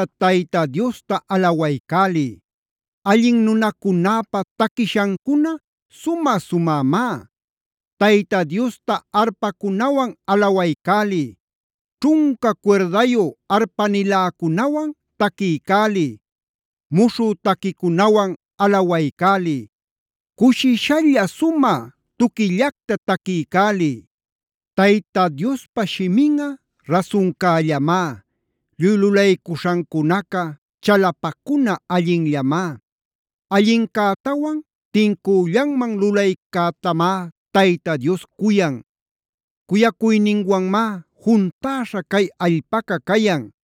Tayta Diosta alawaycäliy; allin nunacunäpa taquiśhancuna sumä-sumämá. Tayta Diosta arpacunawan alawaycäliy; ćhunca cuirdayu arpaniläcunawan taquiycäliy. Muśhü taquicunawan alawaycäliy. Cushishalla sumä tuquillacta taquiycäliy. Tayta Diospa shiminꞌa rasuncällamá; lluy lulaycuśhancunaca chalapacuna allinllamá. Allincätawan tincüllanman lulaycätamá Tayta Dios cuyan; cuyacuyninwanmá juntäśha cay allpaca cayan.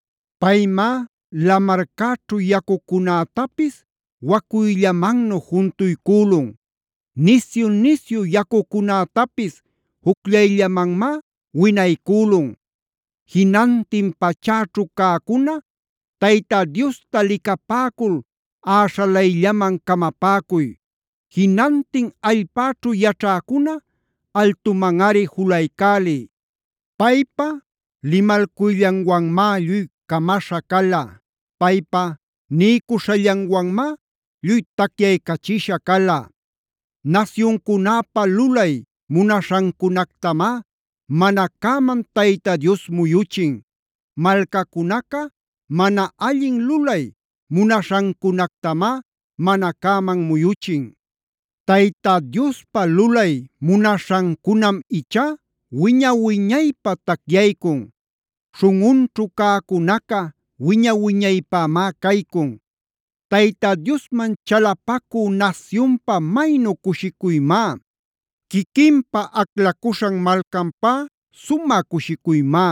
Paymá lamarcäćhu yacucunätapis wacuyllamannu juntuycülun; nisyu-nisyu yacucunätapis jucllayllamanmá winaycülun. Jinantin pachäćhu cäcuna Tayta Diosta licapäcul äśhalayllamanc camapäcuy. Jinantin allpäćhu yaćhäcuna altumanꞌari juluycäliy. Paypa limalcuyllanwanmá lluy camaśha cala. Paypa niycuśhallanwanmá lluy tacyaycachisha cala. Nasyuncunäpa lulay munaśhancunactamá mana cäman Tayta Dios muyuchin; malcacunaca mana allin lulay munaśhancunactamá mana cäman muyuchin. Tayta Diospa lulay munaśhancunam ichá wiña-wiñaypä tacyaycun. Śhunꞌunćhu cäcunaca wiña-wiñaypämá caycun. Tayta Diosman chalapacü nasyunpä maynu cushicuymá.d Quiquinpä aclacuśhan malcapä sumä cushicuymá.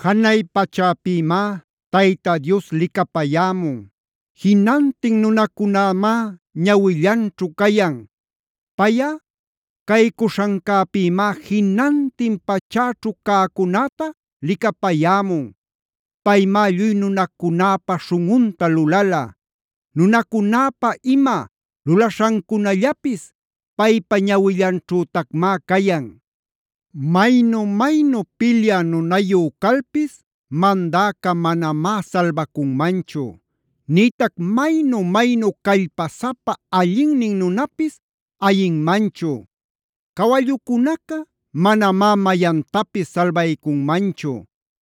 Janay pachäpïmá Tayta Dios licapayämun; jinantin nunacunämá ñawillanćhu cayan. Payꞌa caycuśhancäpïmá jinantin pachäćhu cäcunäta licapayämun. Paymá lluy nunacunäpa śhunꞌunta lulala. Nunacunäpa ima lulaśhancunallapis paypa ñawillanćhütacmá cayan. Maynu-maynu pilyä nunayu calpis mandäca manamá salbacunmanchu; nïtac maynu-maynu callpasapa allinnin nunapis ayinmanchu. Cawallucunaca manamá mayantapis salbaycunmanchu.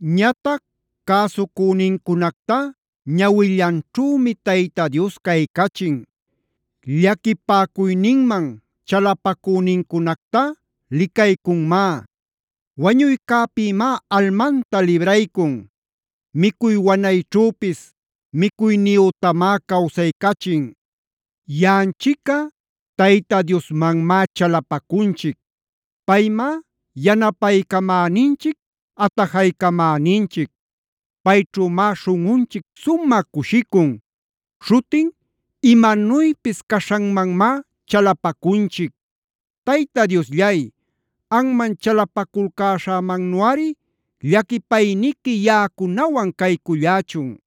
Ñatac cäsucünincunactá ñawillanćhümi Tayta Dios caycachin; llaquipäcuyninman chalapacünincunactá licaycunmá. Wañuycäpïmá almanta libraycun. Micuy wanayćhüpis micuyniyütamá cawsaycachin. Yaꞌanchicꞌa Tayta Diosmanmá chalapacunchic. Paymá yanapaycamäninchic, atajaycamäninchic. Payćhümá śhunꞌunchic sumä cushicun. Śhutin imanuypis caśhanmanmá chalapacunchic. Tayta Diosllay, anman chalapaculcäśhämannuꞌari llaquipayniqui yaꞌacunawan caycullächun.